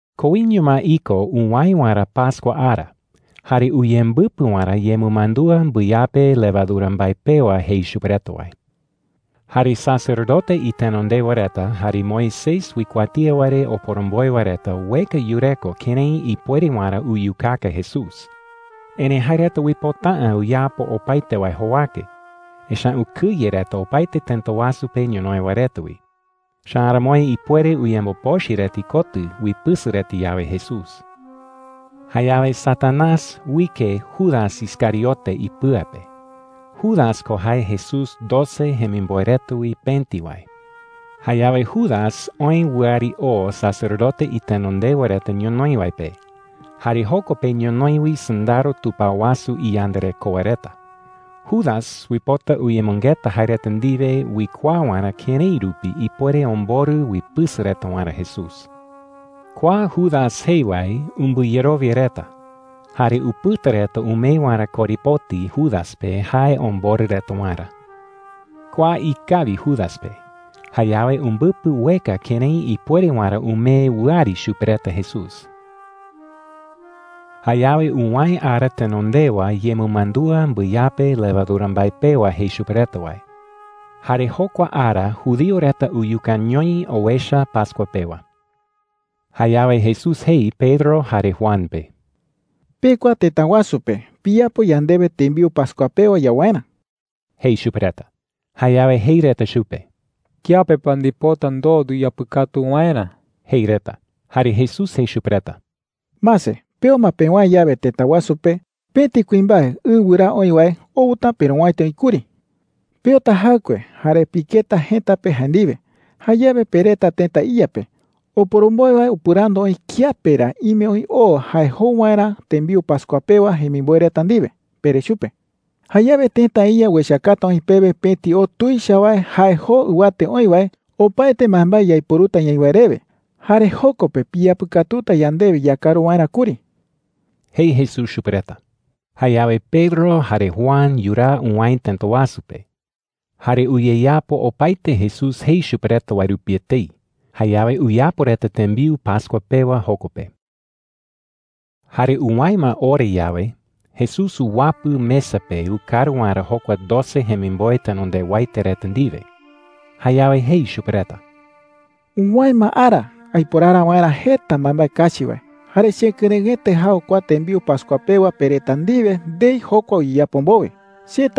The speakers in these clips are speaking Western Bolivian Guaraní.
Koiño ma iko uwäe waerä pascua ara jare uyembɨpɨ waerä yemɨmandúa mbɨyape levadura mbae pewa jei chupe reta wae. Jare sacerdote itenondewa reta jare Moisés uikuatía wae re oporomboe wae reta ueka yureko kërái ipuere waerä uyukaka Jesús. Erëi jae reta uipota’ä uyapo opaete wae jowake, echa’ä ukɨye reta opaete tëta wasu pe ñonoï wae reta wi. Echa’ä aramoi ipuere uyembopochɨ reta ikotɨ uipɨsɨ reta yawe Jesús. Jayawe Satanás uike Judas Iscariote ipɨa pe. Judas ko jae Jesús doce jemimboe reta wi pëti wae. Jayawe Judas oë wɨari oo sacerdote itenondewa reta ñonoï wae pe. Jare joko pe ñonoï wi sɨndaro tupao wasu iyandarekoa reta. Judas uipota uyemɨngeta jae reta ndiwe uikuaa waerä kërái rupi ipuere omborɨ uipɨsɨ reta waerä Jesús. Kua Judas jei wae umbɨyerowia reta. Jare upɨta reta umee waerä korepoti Judas pe jae omborɨ reta waerä. Kua ikawi Judas pe. Jayawe umbɨpɨ ueka kërái ipuere waerä umee wɨari chupe reta Jesús. Jayawe uwäe ara tenondewa yemɨmandúa mbɨyape levadura mbae pewa jei chupe reta wae. Jare jokua ara judío reta uyukañoi owecha pascua pewa. Jayawe Jesús jei Pedro jare Juan pe: “Pekua tëta wasu pe piyapo yandewe tembiu pascua pewa yau waerä,” jei chupe reta. Jayawe jei reta chupe: “¿Kiape pa ndipota ndoo nduyapɨkatu waerä?” jei reta. Jare Jesús jei chupe reta: “Mase, peo ma pewäe yawe tëta wasu pe, pëti kuimbae ɨ wɨraa oï wae outa perowäiti oï kuri,” jei chupe reta. “Peota jaɨkue jare piketa jëta pe jae ndiwe. Jayawe pereta tëta iya pe: ‘Oporomboe wae upɨrandu oï kiape ra ime oï o jae jou waerä tembiu pascua pewa jemimboe reta ndiwe,’ pere chupe. Jayawe tëta iya uechakata oï pewe pëti o tuicha wae jae joo ɨwate oï wae, opaete mbaembae yaiporuta ñaï wae rewe. Jare joko pe piyapɨkatuta yandewe yakaru waerä kuri,” jei Jesús chupe reta. Jayawe Pedro jare Juan yuraa uwäe tëta wasu pe. Jare uyeyapo opaete Jesús jei chupe reta wae rupi etei. Jayawe uyapo reta tembiu pascua pewa joko pe. Jare uwäe ma ora yawe, Jesús uwapɨ mesa pe ukaru waerä jokua doce jemimboe tenondewaete reta ndiwe. Jayawe jei chupe reta: “Uwäe ma ara aiporara waerä jeta mbaembae kachi wae. Jare chekɨrëɨete jau kua tembiu pascua pewa pe reta ndiwe ndei jokua uyeyapo mbowe,” jei.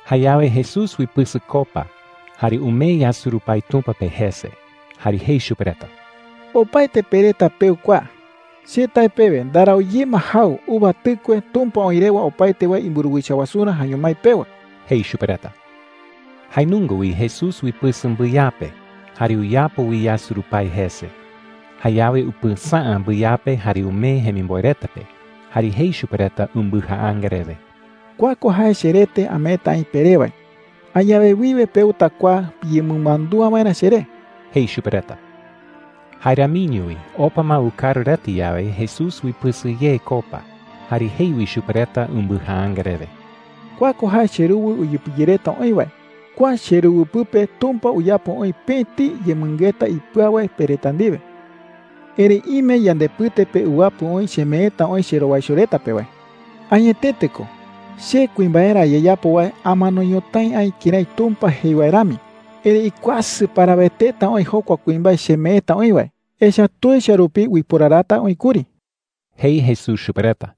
Jayawe Jesús uipɨsɨ copa jare umee yasurupái Tumpa pe jese. Jare jei chupe reta: “Opaete pe reta peu kua,” jei. “Che tae pewe, ndarau ye ma jau uva tɨkue Tumpa oï rewa opaete wae imburuwicha wasurä jaeño mái pewa,” jei chupe reta. Jae nunga wi Jesús uipɨsɨ mbɨyape jare uyapo wi yasurupái jese. Jayawe upɨsäa mbɨyape jare umee jemimboe reta pe, jare jei chupe reta umbɨjaanga rewe: “Kua ko jae cherete ameeta aï peré wae. Añawe wiwe peuta kua piyemɨmandúa waerä cheré,” jei chupe reta. Jae ramiño wi opa ma ukaru reta yawe, Jesús uipɨsɨ ye copa jare jei wi chupe reta umbɨjaanga rewe: “Kua ko jae cheruwɨ uyepɨyereta oï wae. Kua cheruwɨ pɨpe Tumpa uyapo oï pëti yemɨngeta ipɨau wae pe reta ndiwe,” jei chupe reta. “Erëi ime yandepɨte pe uwapɨ oï chemeeta oï cherowaicho reta pe wae,” jei. “Añetete ko, che kuimbaerä ayeyapo wae amano ñotái aï kërái Tumpa jei wae rami. Erëi ikuasɨ paraweteta oï jokua kuimbae chemeeta oï wae, echa’ä tuicha rupi uiporarata oï kuri,” jei Jesús chupe reta.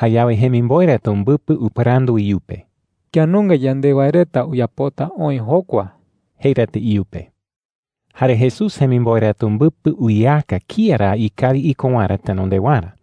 Jayawe jemimboe reta umbɨpɨ upɨrandu iyupe: “¿Kía nunga yande wae reta uyapota oï jokua?” jei reta iyupe. Jare Jesús jemimboe reta umbɨpɨ uyeaka kía ra ikawi iko waerä tenondewarä.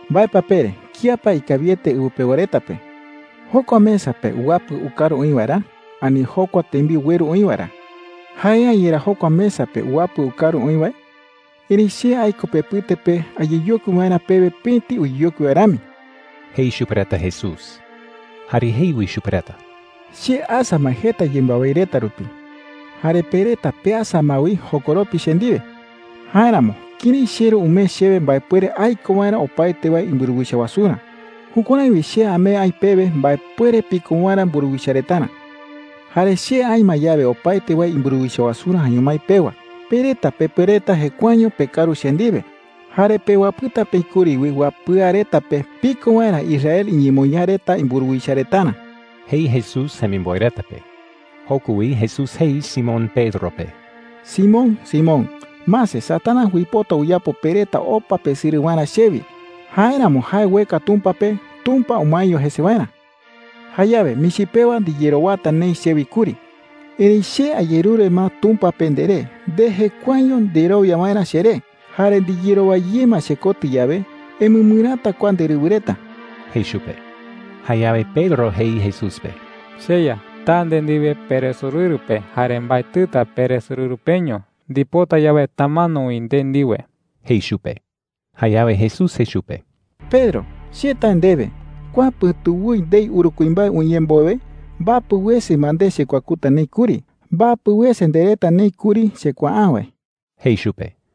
“¿Mbae pa pere? ¿Kía pa ikawiete ɨwɨ pewa reta pe: jokua mesa pe uwapɨ ukaru oï wae ra, ani jokua tembiu ueru oï wae ra? ¿Jae’ä yerá jokua mesa pe uwapɨ ukaru oï wae? Erëi che aiko pepɨte pe ayeyokui waerä pewe pëti uyeyokui wae rami,” jei chupe reta Jesús. Jare jei wi chupe reta: “Che asa ma jeta yembɨawái reta rupi. Jare pe reta peasa ma wi jokoropi che ndiwe,” jei chupe reta. “Jáeramo kërái cheRu umee chewe mbaepuere aiko waerä opaete wae imburuwicha wasurä, jukuärái wi che amee aï pewe mbaepuere piko waerä mburuwicha retarä,” jei chupe reta. “Jare che aï ma yawe opaete wae imburuwicha wasurä jaeño mái pewa, pe reta pepuereta jekuaeño pekaru che ndiwe. Jare pewapɨta peï kuri wi wapɨa reta pe piko waerä Israel iñemoñaa reta imburuwicha retarä,” jei Jesús jemimboe reta pe. Joko wi Jesús jei Simón Pedro pe: “Simón, Simón, mase, Satanás uipota uyapo pe reta opa pesɨrɨ waerä chewi. Jáeramo jae ueka Tumpa pe Tumpa umaeño jese waerä,” jei chupe. “Jayawe michi pewa ndiyerowata neï chewi kuri. Erëi che ayerure ma Tumpa pe nderé nde jekuaeño nderowia waerä cheré. Jare ndiyerowa ye ma chekotɨ yawe, emɨmɨräta kua nderɨwɨ reta,” jei chupe. Jayawe Pedro jei Jesús pe: “CheYa, taa nde ndiwe peresorɨru pe – jare mbaetɨta peresorɨru peño. Ndipota yawe, tamano wi nde ndiwe,” jei chupe. Jayawe Jesús jei chupe: “Pedro, che tae ndewe, kua pɨ̈tu woi, ndei uru kuimbae uñee mbowe, mbapɨ wese ma nde chekuakuta neï kuri. Mbapɨ wese ndereta neï kuri chekuaa’ä wae,” jei chupe.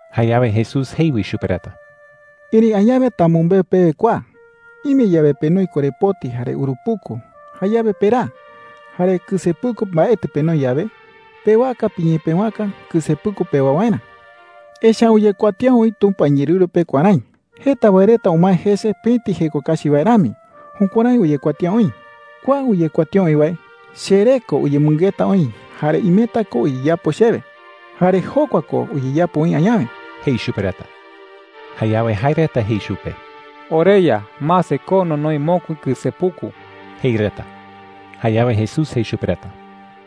Jayawe Jesús jei wi chupe reta: “Erëi añawe tamɨmbeu pewe kua: Ime yawe penoi korepoti jare urupuku, jayawe peraa. Jare kɨsepuku mbaetɨ penoi yawe, pewaka piñepëwaka kɨsepuku pewa waerä,” jei. “Echa’ä uyekuatía oï Tumpa iñeerɨru pe kuärái: ‘Jeta wae reta umae jese pëti jeko kachi wae rami.’ Jukuärái uyekuatía oï,” jei. “Kua uyekuatía oï wae, cheré ko uyemɨngeta oï jare imeta ko uyeyapo chewe. Jare jokua ko uyeyapo oï añawe,” jei chupe reta. Jayawe jae reta jei chupe: “OreYa, mase, ko nonoi mokui kɨsepuku,” jei reta. Jayawe Jesús jei chupe reta: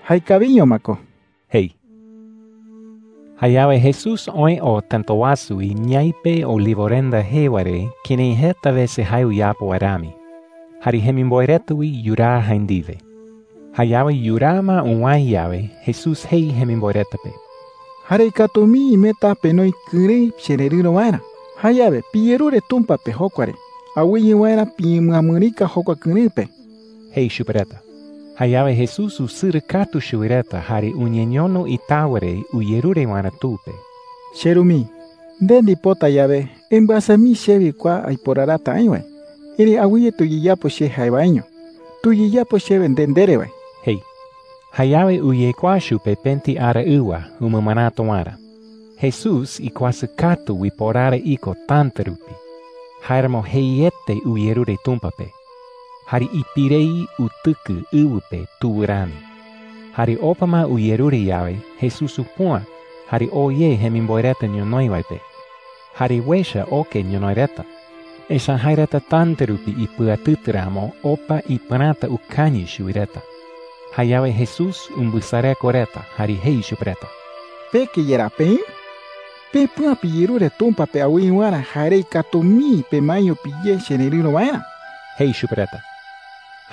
“Jaekawiño ma ko,” jei. Jayawe Jesús oë oo tëta wasu wi ñaipe Olivorenda jee wae re kërái jeta wese jae uyapo wae rami. Jare jemimboe reta wi yuraa jae ndiwe. Jayawe yuraa ma uwäe yawe, Jesús jei jemimboe reta pe: “Jarei katu mii imeta penoi kɨrëɨ chererɨ̈ro waerä. Jayawe piyerure Tumpa pe jokua re awɨye waerä piñemɨamɨrika jokua kɨrëɨ pe,” jei chupe reta. Jayawe Jesús usɨrɨ katu chuwi reta, jare uñeñono itawa re uyerure waerä Tu pe. “CheRu mii,” jei. “Nde ndipota yawe, embɨasa mii chewi kua aiporarata aï wae. Erëi awɨye tuyeyapo che jae waeño. Tuyeyapo chewe nde ndere wae,” jei. Jayawe uyekuaa chupe pëti araɨwa umɨmɨräta waerä. Jesús ikuasɨ katu uiporara iko täta rupi; jáeramo jeiete uyerure Tumpa pe. Jare ipirei utɨkɨ ɨwɨ pe tuwɨ rami. Jare opa ma uyerure yawe, Jesús upüa jare oo ye jemimboe reta ñonoï wae pe. Jare uecha oke ñonoï reta. Echa’ä jae reta täta rupi ipɨatɨtɨ ramo opa ipɨräta ukañɨ chuwi reta. Jayawe Jesús umbɨsareko reta jare jei chupe reta: “¿Peke yerá peï? Pepüa, piyerure Tumpa pe awɨye waerä jarei katu mii pemaeño piyé chererɨ̈ro waerä,” jei chupe reta.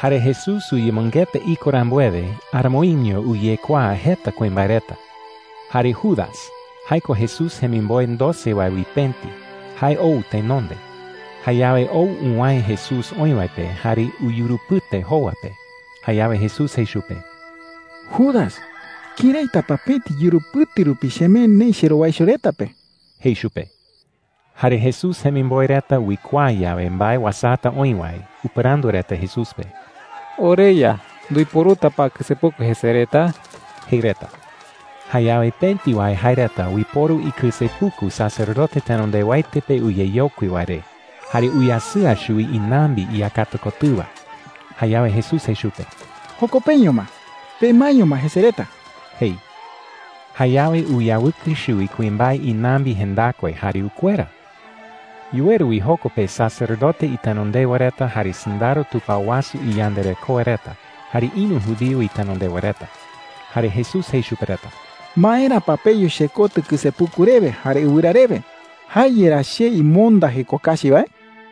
Jare Jesús uyemɨngeta iko rambuewe, aramoiño uyekuaa jeta kuimbae reta. Jare Judas – jae ko Jesús jemimboe doce wae wi pëti – jae ou tenonde. Jayawe ou uwäe Jesús oï wae pe jare uyurupɨte jowa pe. Jayawe Jesús jei chupe: “Judas, ¿këraita pa pëti yurupɨte rupi chemee neï cherowaicho reta pe?” jei chupe. Jare Jesús jemimboe reta uikuaa yawe mbae uasata oï wae, upɨrandu reta Jesús pe: “OreYa, ¿nduiporuta pa kɨsepuku jese reta?” jei reta. Jayawe pëti wae jae reta uiporu ikɨsepuku sacerdote tenondewaete pe uyeyokui wae re, jare uyasɨa chuwi inambi iyakata kotɨwa. Jayawe Jesús jei chupe: “¡Joko peño ma! ¡Pemaeño ma jese reta!” jei. Jayawe uyawɨkɨ chuwi kuimbae inambi jendakue, jare ukuera. Yuweru wi joko pe sacerdote itenondewa reta, jare sɨndaro tupao wasu iyandarekoa reta, jare ïru judío itenondewa reta. Jare Jesús jei chupe reta: “¿Maera pa peyu chekotɨ kɨsepuku rewe jare ɨwɨra rewe? ¿Jae yerá che imonda jeko kachi wae?” jei.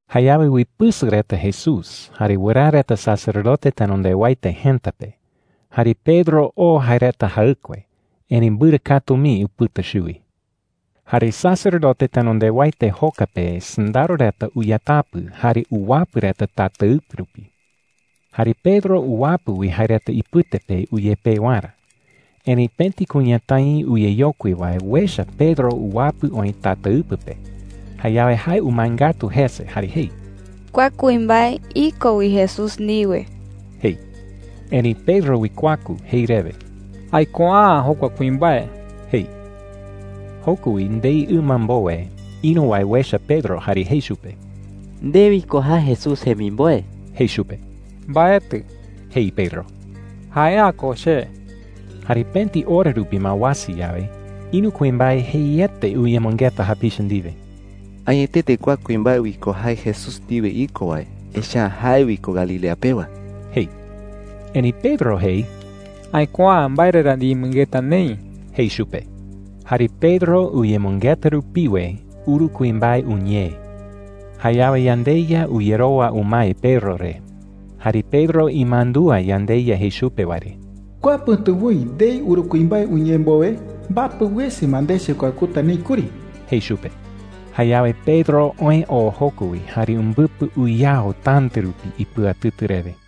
Jayawe uipɨsɨ reta Jesús jare wɨraa reta sacerdote tenondewaete jëta pe. Jare Pedro oo jae reta jaɨkue, erëi mbɨrɨ katu mii upɨta chuwi. Jare sacerdote tenondewaete joka pe sɨndaro reta uyatapɨ jare uwapɨ reta tataɨpɨ rupi. Jare Pedro uwapɨ wi jae reta ipɨte pe uyepee waerä. Erëi pëti kuñatái uyeyokui wae uecha Pedro uwapɨ oï tataɨpɨ pe. Jayawe jae umae ngatu jese jare jei: “Kua kuimbae iko wi Jesús ndiwe,” jei. Erëi Pedro uikuaku jei rewe: “Aikuaa’ä jokua kuimbae,” jei. Joko wi ndei ɨma mbowe, ïru wae uecha Pedro jare jei chupe: “Nde wi ko jae Jesús jemimboe,” jei chupe. “Mbaetɨ,” jei Pedro. “Jae’ä ko che.” Jare pëti ora rupi ma uasa yawe, ïru kuimbae jeiete uyemɨngeta japicha ndiwe: “Añetete kua kuimbae wi ko jae Jesús ndiwe iko wae, echa’ä jae wi ko Galilea pewa,” jei. Erëi Pedro jei: “Aikuaa’ä mbae re ra ndiyemɨngeta neï,” jei chupe. Jare Pedro uyemɨngeta rupiwe, uru kuimbae uñee. Jayawe yandeYa uyerowa umae Pedro re. Jare Pedro imandúa yandeYa jei chupe wae re: “Kua pɨ̈tu woi, ndei uru kuimbae uñee mbowe, mbapɨ wese ma nde chekuakuta neï kuri,” jei chupe. Jayawe Pedro oë oo joko wi, jare umbɨpɨ uyao täta rupi ipɨatɨtɨ rewe.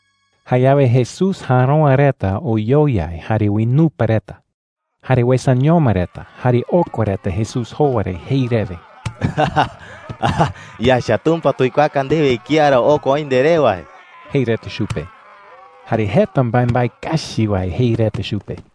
Jayawe Jesús järoa reta oyoyai jare uinupa reta. Jare uesañoma reta, jare okua reta Jesús jowa re jei rewe: “Yaecha Tumpa tuikuaaka ndewe kía ra okua oï nderé wae,” jei reta chupe. Jare jeta mbaembae kachi wae jei reta chupe.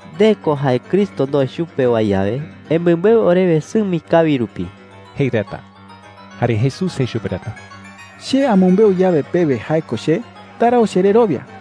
“Nde ko jae Cristo ndoe chupe wae yawe, emɨmbeu orewe sɨmi kawi rupi,” jei reta. Jare Jesús jei chupe reta: “Che amɨmbeu pewe yawe jae ko che, ndarau chererowia.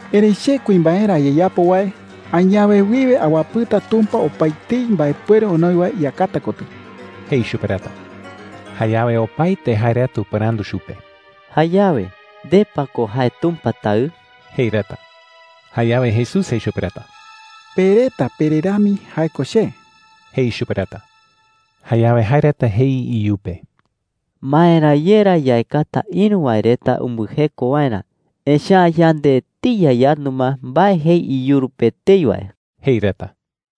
“Erëi che kuimbaerä ayeyapo wae añawe wiwe awapɨta Tumpa opaetei mbaepuere onoi wae iyakata kotɨ,” jei chupe reta. Jayawe opaete jae reta upɨrandu chupe: “Jayawe, ¿nde pa ko jae Tumpa Taɨ?” jei reta. Jayawe Jesús jei chupe reta: “Pe reta pere rami jae ko che,” jei chupe reta. Jayawe jae reta jei iyupe: “¿Maera ye ra yaekata ïru wae reta umbɨjeko waerä? Echa’ä yande etei yayandu ma mbae jei iyuru pe etei wae,” jei reta.